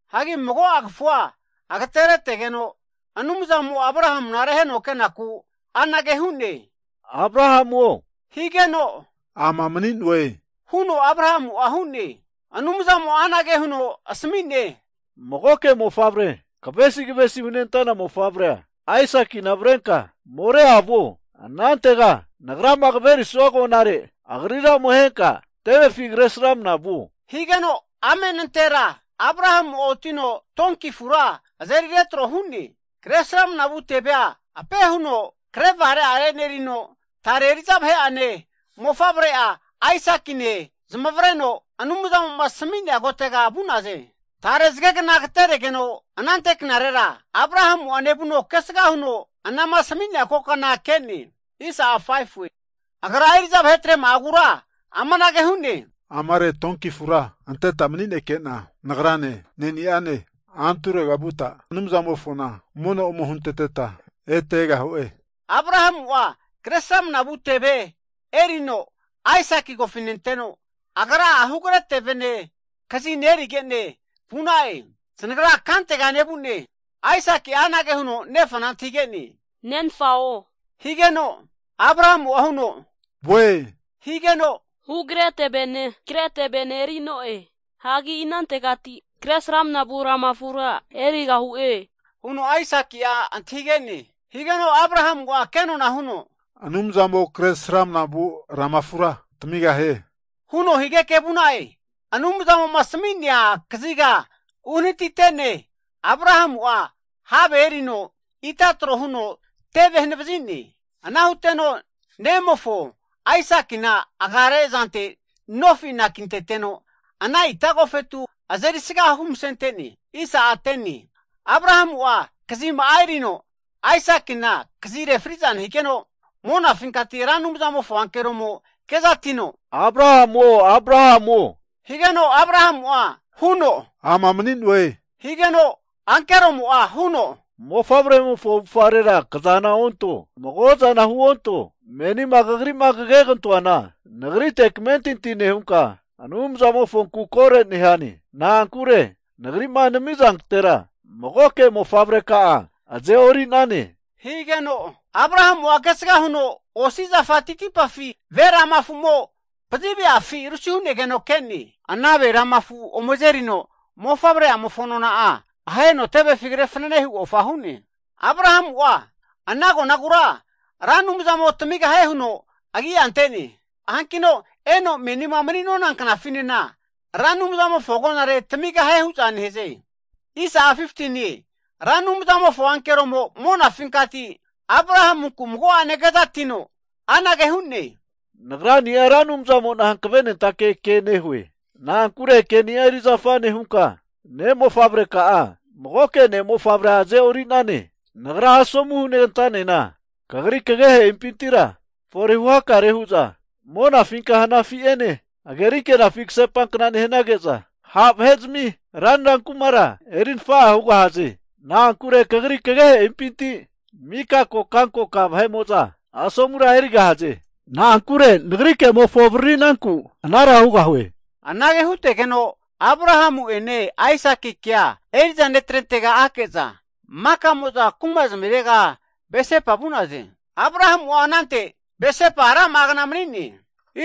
Hagi mago'a kafua agateretegeno Anumzamo'a Abrahamuna reheno kenaku anage hu'ne, Abrahamuo higeno, ama mani'noe huno Abrahamu'a hu'ne. Anumzamo'a anage huno asami'ne, Magoke mofavre, kavesi kavesi hunentana mofavrea Aisakina avrenka Morea moparega vuo, Nagrama kaverisua agonare anantega agrira ome ahenka tevefi Kresramana vuo. Higeno amenantera Abrahamu'a otino donki afura azeri retro nehuno, Kresramana vu tevea ape huno krevare'are enerino, tare eri'za vahe'ane mofavre'a Aisakine zamavareno, Anumzamo asmi'nea kotega vu'naze. Tare zagegna agateregeno, anante knarera Abrahamu'a nevuno kesga huno anama asmi'nea kokana ke'ne. Agra eri'za vahetrema'agura amanage hu'ne, Amare donki afura anteta mani'neke'na nagrane ne'ni'ane anturega vuta Anumzamofona mono ome hunteteta ete egahu'e. Abrahamu'a Kresramana vu teve erino Aisaki kofinenteno, agra'a hugre tevene, kazine erige'ne vu'na'e. Zanagra kantega nevu'ne, Aisaki'a anage huno nefana antahige'ne, Nenfao, higeno Abrahamu huno, voe, higeno, Hugre tevene, kre tevene eri'noe. Hagi inantegati Kresramana vu lama afura erigahu'e? Huno Aisaki'a antahige'ne. Higeno Abrahamu'a kenona huno, Anumzamo Kresramanavu lama afura tamigahie, huno higeke vu'na'e. Anumzamo'ma asami'nea kaziga unehanati'ne, Abrahamu'a have erino ita tro huno teve hanavazine. Ana huteno nemofo, Aisakina agare azante nofi anakinteteno, ana ita agofetu azeri sga humasente'ne. Abrahamu'a kazima'a erino Aisakina kazi refriku nehigeno, monafinkati Ra Anumzamofo ankeromo kezatino, Abrahamuo! Abrahamuo! Higeno Abrahamu'a huno, Ama mani'noe. Higeno ankeromo'a huno, Mofavremofo avufgarera kazana onto, mago'zana huonto. Menima kagri'ma kagentoana Nagrite kamentinti nehunka, Anumzamofonku kore nehane. Na'ankure Nagri'ma nami'zantera magoke mofavreka'a aze'orinane. Higeno Abrahamu'a kesga huno osi zafa titipafi ve rama afumo pazive'afi rusi hu'negeno ke'ne. Ana ve rama afu ome azerino mofavre'amofo nona'a aheno tevefi kre fananehu ofa hu'ne. Abrahamu'a ana agonagura Ra Anumzamo tamigahie huno agi'a ante'ne. Hankino eno menima mani'nona knafinena, Ra Anumzamofo agonare tamigahie hu'za nehaze. Ra Anumzamofo ankeromo monafinkati Abrahamunku mago'ene kezatino, Anage hu'ne, Nagrani'a Ra Anumzamo'na hankavenentake ke nehue, na'ankure ke'nia erizafa nehunka ne'mofavreka'a, magoke ne'mofavrea azeorinane. Nagra asomu huneganta'nena kagri kagehe'impintira fore huhakare hu'za monafinka hanafi ene hagerinkenafi kasepankna nehanage'za, ha' vahe'zmi ranra kumara eri nafa'a hugahaze. Na'ankure kagri kagehe'impinti mika kokankoka vahe'mo'za asomura erigahaze. Na'ankure nagri ke'mofo avaririnanku anara hugahue. Anage hutegeno, Abrahamu'ene Aisakikea eri'za ne'trentega ake'za, maka'mo'za kuma zamirega Berseba vu'naze. Abrahamu'a anante Berseba rama'a kna mani'ne.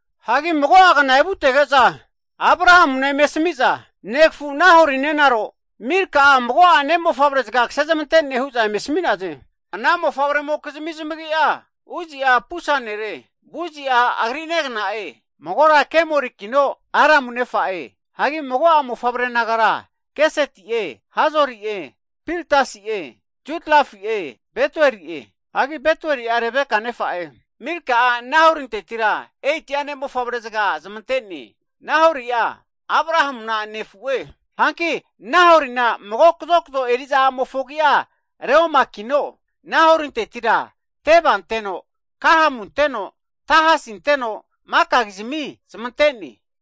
Hagi mago'a kna evutege'za, Abrahamuna eme asamiza, Negafu Nahori nenaro Milka'a mago'a ne'mofavre'zaga kasezmante'ne hu'za eme asami'naze. Ana mofavremokizmi zamagi'a, Uzi'a pusa nere, Buzi'a agri negna'e, magora Kemuelikino Aramu nefa'e. Hagi mago'a mofavre nagara Keseti'e, Hazori'e Pildasi'e, Judlafi'e, Betueli'e. Hagi Betueli'a Rebeka nefa'e. Milka'a, Nahorintetira 8'a ne'mofavre zaga zamante'ne. Nahori'a Abrahamuna nefu'e. Hanki Nahorina mago kazokzo eri'za a'mofo agi'a Reumakino, Nahorintetira Teba anteno, Gahamu anteno, Tahasi anteno, Makakizmi zamante'ne.